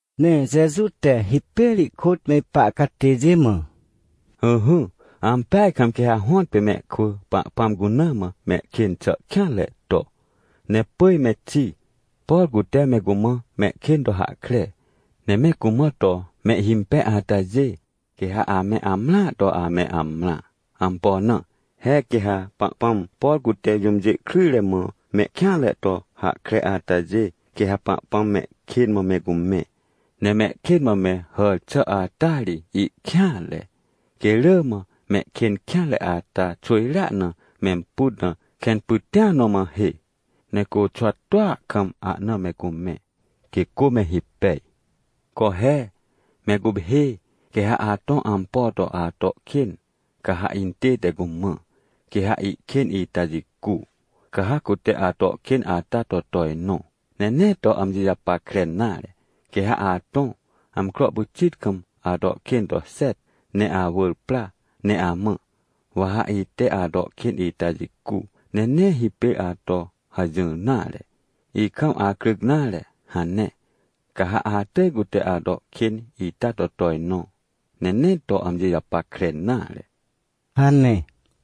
Ne Jeju te hipêr ihkôt me ipa catêjê mã: ― Ỹhỹ, ampeaj kam quê ha hõtpê mehkwỳ, Pahpãm cuna mã mehkên xà kêanre to. Ne pỳj me xi, por cute me cumã mehkên to hahkre, ne me cumã to mehhimpej atajê, quê ha ame amrãa to ame amrã. Ampo na? He quê ha Pahpãm, por cute jũmjê kryjre mã mehkêanre to hahkre atajê, quê ha Pahpãm mehkên mã me cumẽ. Ne mehkên mã me hàr xà ata ri ihkêanre. Quê rỳ mã mehkên kêanre ata xwỳjrea na memput na kẽn pytĩa nõ mã hê, ne côxwa tua kam ahna me cumẽ, quê cô me hipej. Co he, me guphê! Quê ha atõ ampo to ato kên, ca ha intête cumã. Quê ha ihkên ita jicu, ca ha cute ato kên ata to tojnõ, ne nee to amji japackre nare. Quê ha atõ, amcro pyxit kam, ato kên to xet, ne awỳr pra ne amã: “Wa ha ite ato kên ita jicu. Ne nee hipêr ato hajỹr nare. Ikam acryc nare” hane. Ca ha atỳj cute ato kên ita to tojnõ, ne nee to amji japackre nare ― hane.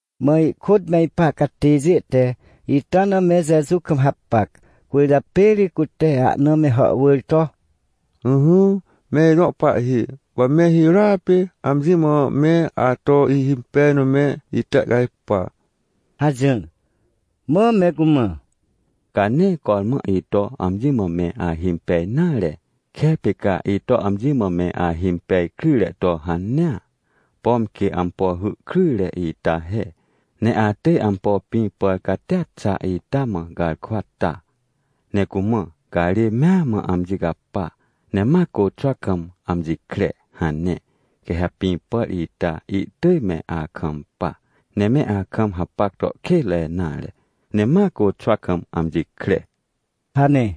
Mã ihkôt me ipa catêjê te ita na me Jeju kam hapac, cwỳrjapê ri cute ahna me hàhwỳr to: ― Ỹhỹ, me ijõ Pahhi. Wa me hirôa pê amji mã me ato ihimpej na me itehcajpa ― hajỹr. Mã me cumã: ― Ca nee cormã ito amji mã me ahimpej nare. Kepê ca ito amji mã me ahimpej kryjre to hanea, pom quê ampo hy kryjre ita he, ne atỳj ampo pĩ pàr catia xa ita mã garkwa ta, ne cumã: “Garê mea mã amji capa, ne ma côxwa kam amji kre” hane. Quê ha pĩ pàr ita ihtỳj me akampa, ne me akam hapac to kênre nare, ne ma côxwa kam amji kre ― hane.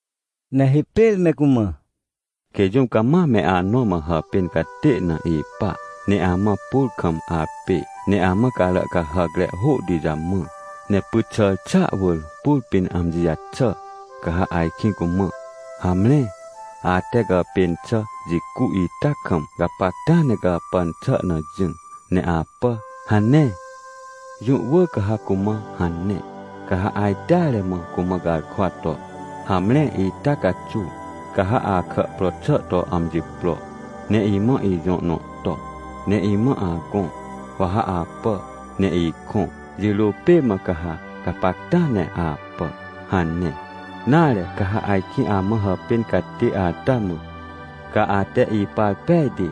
Ne hipêr me cumã: ― Quê jũm cama me anõ mã hàpên catê na ipa, ne amã pur kam apê, ne amã carà cahàcre hôhti jamã, ne pyt xàr xàa wỳr pur pĩn amji jaxà, ca ha ajkĩ cumã: “Hamre, ate gàpên xà jicu ita kam gapacta ne gàpàn xà na jỹ ne apà” hane? Jũ wỳr ca ha cumã hane. Ca ha ajteare mã cumã garkwa to: “Hamre, ita caxuw ca ha akà pro xà to amji pro, ne imã ijõ nõ to, ne imã agõ, wa ha apà ne ikõ, jirô pê mã ca ha gapacta ne apà” hane. Nare ca ha ajkĩ amã hàpên catê ata mã: “Ca ate ipar pejti,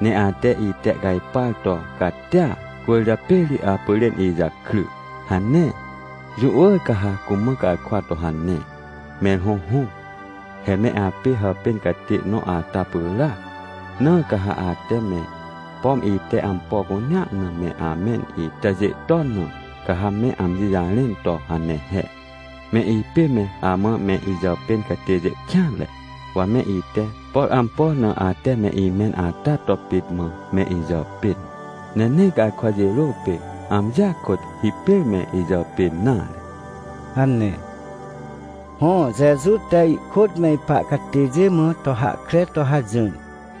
ne ate itehcajpar to catia, cwỳrjapê ri apyrên ijakry” hane? Jũ wỳr ca ha cumã garkwa to hane. ― Mẽr hõhõ, he me apê hàpên catê nõ ata pyràac. Na ca ha ate me, pom ite ampo cunea na me amẽn itajê ton na, ca ha me amji jarẽn to hane he: “Me ipê me amã me ijàpên catêjê kêanre, wa me ite, por ampo na ate me imẽn ata to pit mã me ijàpên, ne nee garkwa jirô pê, amjia kôt hipêr me ijàpên nare” ― hane. Hõ, Jeju te ihkôt me ipa catêjê mã to hahkre to hajỹr.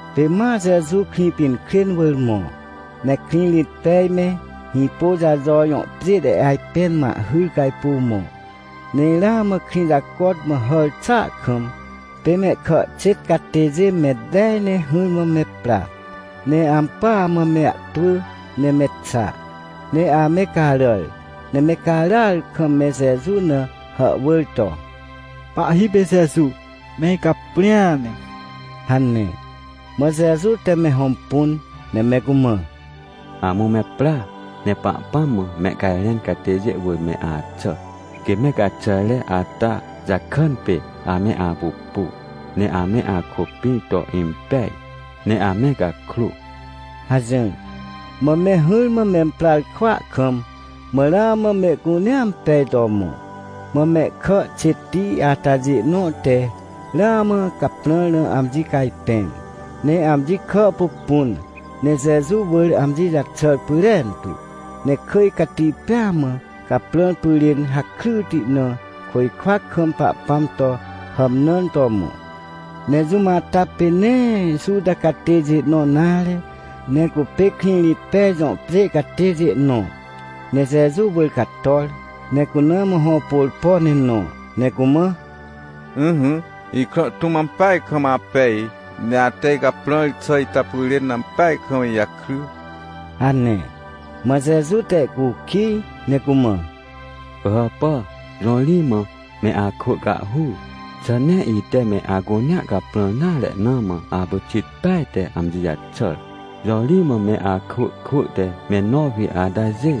Pê ma Jeju Krĩpinkrên wỳr mõ, ne Krĩrĩtpej me Hĩpôjajo jõ pjê te ajpẽn mã ahhyr cajpuw mõ. Ne ramã krĩ jacot mã hàr xàa kam, pê mehkà xêt catêjê me tej ne hỹrmã me pra. Ne ampỳa mã me ahtwỳ ne me xa. Ne ame caràr, ne me caràar kam me Jeju na hàhwỳr to: ― Pahhi pê Jeju! Me icaprĩa ne! ― hane. Mã Jeju te me hõmpun, ne me cumã: ― Amũ me pra, ne Pahpãm mã mehcajrẽn catêjê wỳr me axà, quê me gaxàjre ata jakàn pê ame apupu, ne ame akôpĩr to impej, ne ame gakrô ― hajỹr. Mã me hỹrmã memprar kwỳa kam, mã ramã mehcunea impej to mõ. Mã mehkà xêtti atajê nõ te ramã caprãr na amji cajpẽr, ne amji kà pupun, ne Jeju wỳr amji jaxàr pyrentu, ne kỳj cati pêa mã caprãr pyrên hakryti na, côjkwa kam Pahpãm to hàmnãn to mõ. Ne jũm ata pê nee Juta catêjê nõ nare, ne cupê Krĩrĩtpej jõ pjê catêjê nõ. Ne Jeju wỳr cator, ne cuna mã hõ pôrpo ne nõ, ne cumã: ― Ỹhỹ, ikrã tũm ampeaj kam apej, ne ate icaprãr xà ita pyrên ampeaj kam ijakry ― hane. Mã Jeju te ihcukij ne cumã: ― Pỳhàpà, jõ ri mã me akwỳ cahhur? Xà nee ite me acunea caprãr nare na mã apyxit peaj te amji jaxàr? Jõ ri mã me akwỳ kwỳ te me nowi atajê?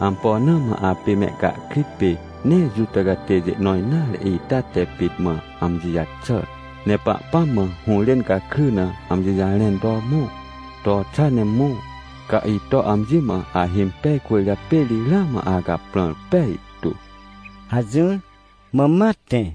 Ampo na mã apê mehcahkrit pê nee Juta catêjê nõ nare ita te pit mã amji jaxàr, ne Pahpãm mã hũrên gakry na amji jarẽn to mõ? To xa ne mõ. Ca ito amji mã ahimpej, cwỳrjapê ri ramã acaprãr pejtu ― hajỹr, mã ma tẽ.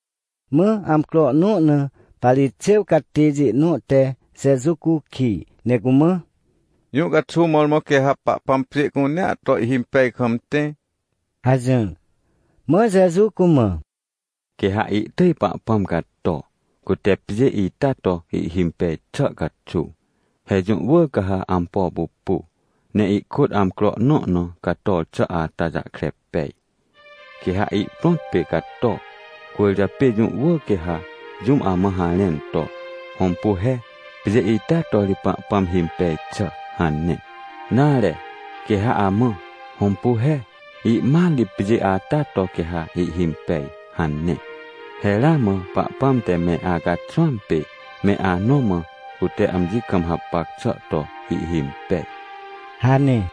Mã amcro nõ na Parixêw catêjê nõ te Jeju cukij, ne cumã: ― Jũ caxuw mõrmõ quê ha Pahpãm pjê cunea to ihhimpej kam tẽ? ― hajỹr. Mã Jeju cumã: ― Quê ha ihtỳj Pahpãm cato, cute pjê ita to ihhimpej xà caxuw. He jũ wỳr ca ha ampo pupu, ne ihkôt amcro nõ na cator xà ata jahkre pej. Quê ha ihprõt pê cato. Cwỳrjapê jũ wỳr quê ha jũm amã harẽn to: “Hõmpu he, pjê ita to ri Pahpãm himpej xà” hane. Nare, quê ha amã: “Hõmpu he, ihmat ri pjê ata to quê ha ihhimpej” hane. He ramã Pahpãm te me acaxwãm pê, me anõ mã, cute amji kam hapac xà to ihhimpej ― hane.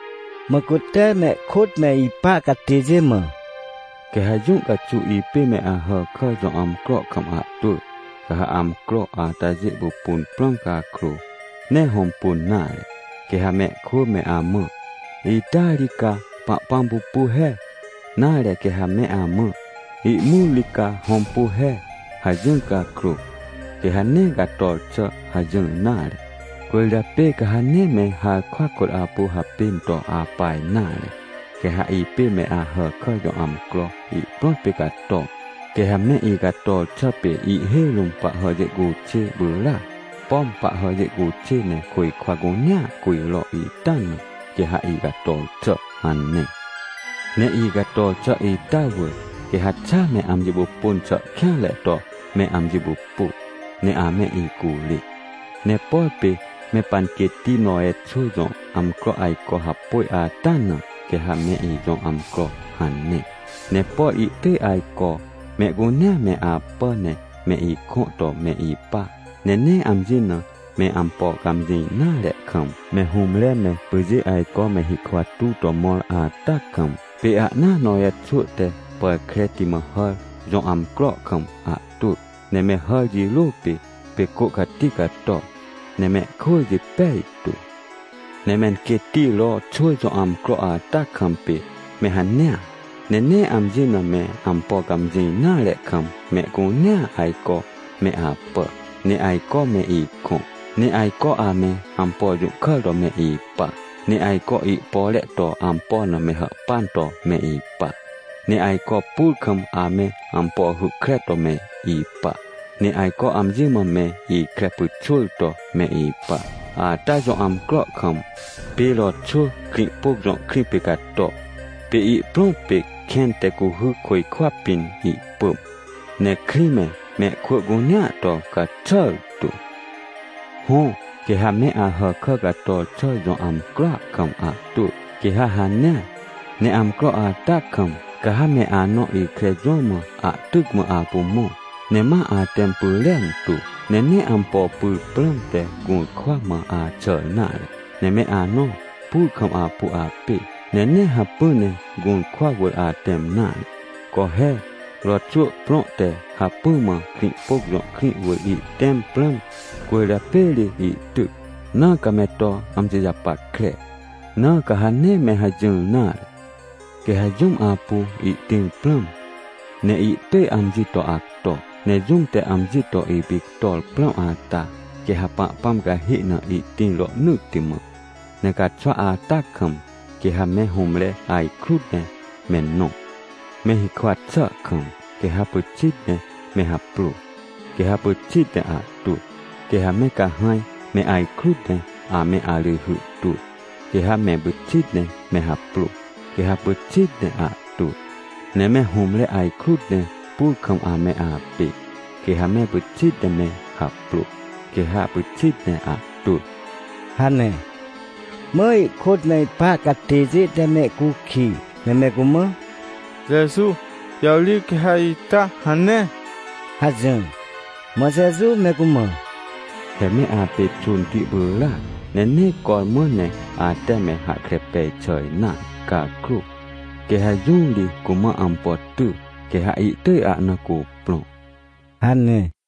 Mã cute mehkôt me ipa catêjê mã: ― Quê ha jũ caxuw ipê me Ahàkà jõ amcro kam ahtwỳ, ca ha amcro atajê pupun prãm cakrô, nee hõmpun nare. Quê ha mehkwỳ me amã: “Ita ri ca Pahpãm pupu he” nare quê ha me amã: “Ihmut ri ca hõmpu he” hajỹr cakrô, quê ha nee cator xà hajỹr nare. Cwỳrjapê ca ha nee me harkwa kôt apu hapên to apa nare. Quê ha ipê me Ahàkà jõ amcro ihprõt pê cato. Quê ha me icator xà pê ihhêj rũm pahhàjê cuxê pyràac. Pom pahhàjê cuxê ne côjkwa cunea cujro ita na, quê ha icator xà hane. Ne icator xà ita wỳr, quê ha xa me amji pupun xà kêanre to me amji pupu, ne ame icurê. ― Ne por pê me panquêtti Nowe xwỳ jõ amcro ajco hapôj ata na, quê ha me ijõ amcro hane. Ne por ihtỳj ajco mehcunea me apà ne me ikõ to me ipa. Ne nee amji na me ampo cãmjĩ nare kam, me hũmre me pyjê ajco me hikwa tuw to mõr ata kam, pê ahnaa Nowe xwỳ te pàr kreti mã hàr jõ amcro kam ahtwỳ. Ne me hàr jirô pê, pê cô cati cato, ne mehkwỳ jipej tu. ― Ne menquêtti Ro xwỳ jõ amcro ata kam pê me hanea. Ne nee amji na me ampo cãmjĩ nare kam mehcunea ajco me apà, ne ajco me ikõ, ne ajco ame ampo jũhkàr to me ipa, ne ajco ihpore to ampo na me hàhpan to me ipa, ne ajco pur kam ame ampo hy kre to me ipa, ne ajco amji mã me ikre pyxwỳr to me ipa. Ata jõ amcro kam, pê Ro xwỳ Krĩhpôc jõ krĩ pê cato, pê ihprõt pê kẽn te cuhy côjkwa pĩn ihpỳm, ne krĩ me, mehkwỳ cunea to caxàr tu. ― Hõ, quê ha me Ahàkà cator xà jõ amcroa kam ahtwỳ, quê ha hanea. Ne amcro ata kam, ca ha me anõ ikre jõ mã ahtyc mã apu mõ, ne ma atẽm pyrentu, ne nee ampo pyr prãmte gũrkwa mã axàr nare. Ne me anõ pur kam apu apê, ne nee hacpỹ ne gũrkwa wỳr atẽm nare. Co he, Ro xwỳ prõ te hacpỹ mã Krĩhpôc jõ krĩ wỳr ihtẽm prãm, cwỳrjapê ri ihtyc, na ca me to amji japackre. Na ca ha nee me hajỹr nare! Quê ha jũm apu ihtĩr prãm, ne ihtỳj amji to acto. Ne jũm te amji to ipictor prãm ata, quê ha Pahpãm cahê na ihtĩr rohnỳtti mã. ― Ne caxwa ata kam, quê ha me hũmre ajkrut ne me nõ, me hikwa xà kam, quê ha pyxit ne me haprô, quê ha pyxit ne ahtwỳ. Quê ha me cahãj me ajkrut ne ame arỳjhy twỳ, quê ha me pyxit ne me haprô, quê ha pyxit ne ahtwỳ. Ne me hũmre ajkrut ne pur kam ame apê, quê ha me pyxit ne me haprô, quê ha pyxit ne ahtwỳ ― hane. Mã ihkôt me ipa catêjê te mehcukij, ne me cumã: ― Jeju, jõ ri quê ha ita hane? ― hajỹr. Mã Jeju me cumã: ― He me apê xônti pyràc, ne nee cormã ne ate me hahkre pej xà nare cakrô, quê ha jũ ri cumã ampo ty, quê ha ihtỳj ahna cuprõ ― hane.